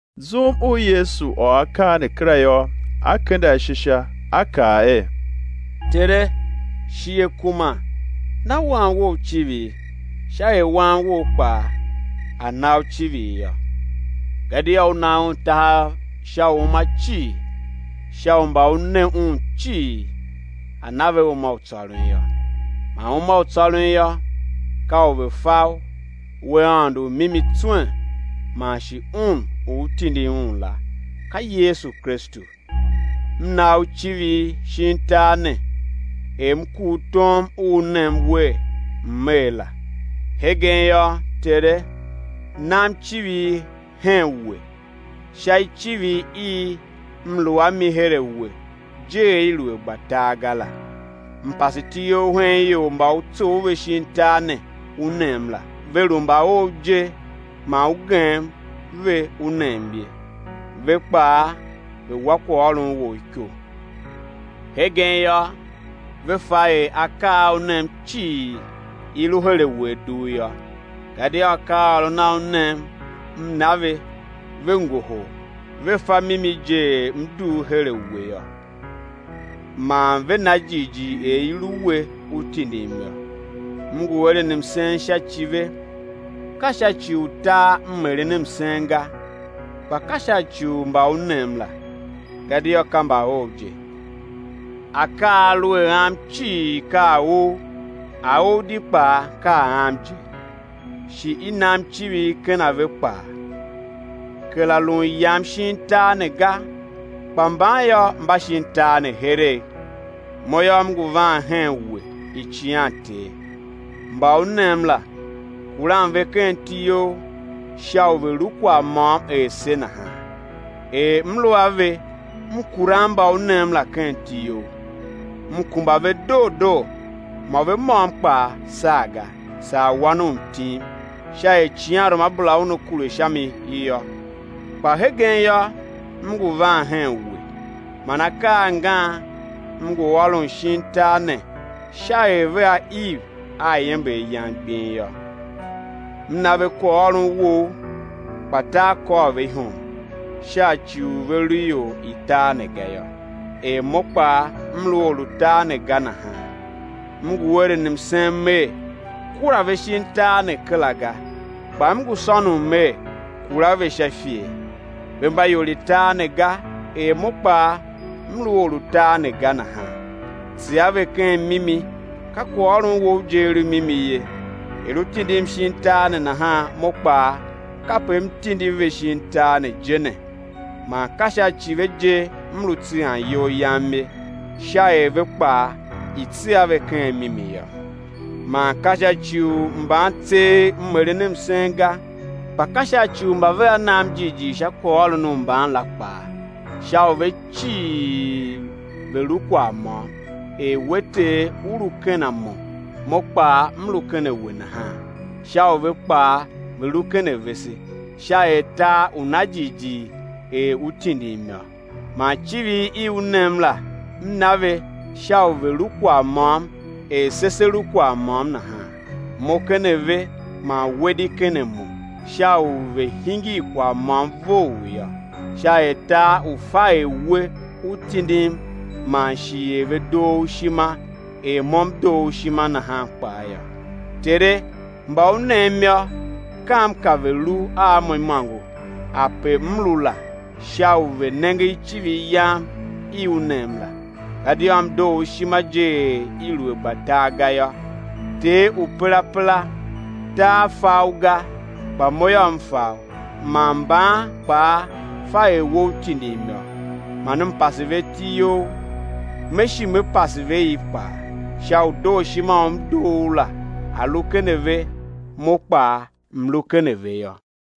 Zum u Yesu ôr akaa ne kera yô, A kende ashe Sha, a kaa er: Tere, shighe kuma, na Wan Wou icivir, sha er Wan Wou kpaa A̱ na U icivir yô, gadia U na Un tahav sha uuma cii, sha u mba U ne Un cii A̱ na ve uma u tsôron yô. Man uma u tsôron yô, ka u ve̱ fa U, We Aôndo u mimi tswen, man shi Un u U tindi la, ka Yesu Kristu. M na U icivir shin tar ne, er M kur tom u U nem wer, M̱ er la. Hegen yô, Tere, nam icivir hen We, sha icivir i M lu a mi her a We je, er i lu a gba tar ga la. M pase iti You hen ior mba U tsough ve shin tar ne, U nem la. Ve lu mba Ou je man U gem ve U nem ye; ve kpaa ve wa kwaghôron wou iko. Hegen yô, ve fa er akaa a U nem cii, i lu her a We a dugh yô; gadia akaaôron a U nem, M na ve, ve ngohol, ve fa mimi je er M dugh her a We yô, man ve na jighjigh er i lu We, U tindim yô. M ngu eren msen sha ci ve; ka sha ci u tar M eren msen ga, kpa ka sha ci u mba U nem la, gadia ka mba Ou je. Akaa a a lu a Am cii ka a Ou, a Ou di kpaa ka a Am je, shi i nam icivir ken a ve kpaa. Kera lun Yam shin tar ne ga, kpa mban yô, mba shin tar ne heregh; Mo yô, M ngu van hen We, Icighan Ter. Mba U nem la, kuran ve ken iti You sha u ve̱ lu kwagh môm er se nahan. Er M lu a ve, M kuran mba U nem la, ken iti You. M kumba ve doo doo, mô ve môm kpaa saa ga, saa wan u mtim, sha er icighanruamabera una kure sha mi yô. Kpa hegen yô, M ngu van hen we, man akaa angan M ngu ôron shin tar ne sha er vea iv a iember Yam gbing yô. M na ve kwaghôron Wou, kpa tar kôr ve ihom, sha ci u ve lu ior i tar ne ga yô, er Mo kpaa M lu or u tar ne ga nahan. M ngu eren msen Mer: Kura ve shin tar ne kera ga, kpa M ngu sônon Mer kura ve sha ifer. Ve mba ior i tar ne ga, er Mo kpaa M lu or u tar ne ga nahan. Tsegha ve ken mimi, ka kwaghôron Wou je a lu mimi ye. Er U tindim shin tar ne nahan, Mo kpaa, kape M tindi ve shin tar ne je ne. Man ka sha ci ve je M lu tseghan iyol Yam ye, sha er ve kpaa i̱ tsegha ve ken mimi yô. Man ka sha ci u mban tseegh M eren msen ga, kpa ka sha ci u mba vea va nam jighjigh sha kwaghôron u mban la kpaa, sha u ve cii ve̱ lu kwagh môm, er We Ter, U lu ken a Mo, Mo kpaa m lu ken a We nahan, sha u ve kpaa ve̱ lu ken avese; sha er tar u̱ na jighjigh er U tindim yô. Man icivir i U nem la, M na ve, sha u ve̱ lu kwagh môm er se se lu kwagh môm nahan. Mo ken a ve, man We di ken a Mo, sha u ve̱ hingir kwagh môm vough yô; sha er tar u̱ fa er We U tindim man shi er ve doo U ishima er M doo U ishima nahan kpaa yô. Tere, mba U nem yô, kam ka ve̱ lu a Mo imôngo ape M lu la, sha u ve̱ nenge icivir Yam i U nem la; gadia M doo U ishima je er i lu a gba tar ga yô. Ter u perapera, tar fa U ga, kpa Mo M fa U, man mban kpaa fa er We U tindim yô. Man M pase ve iti You; Me shi Me pase ve i kpaa; sha u dooshima u M doo U la, a̱ lu ken a ve, Mo kpaa M̱ lu ken a ve yô.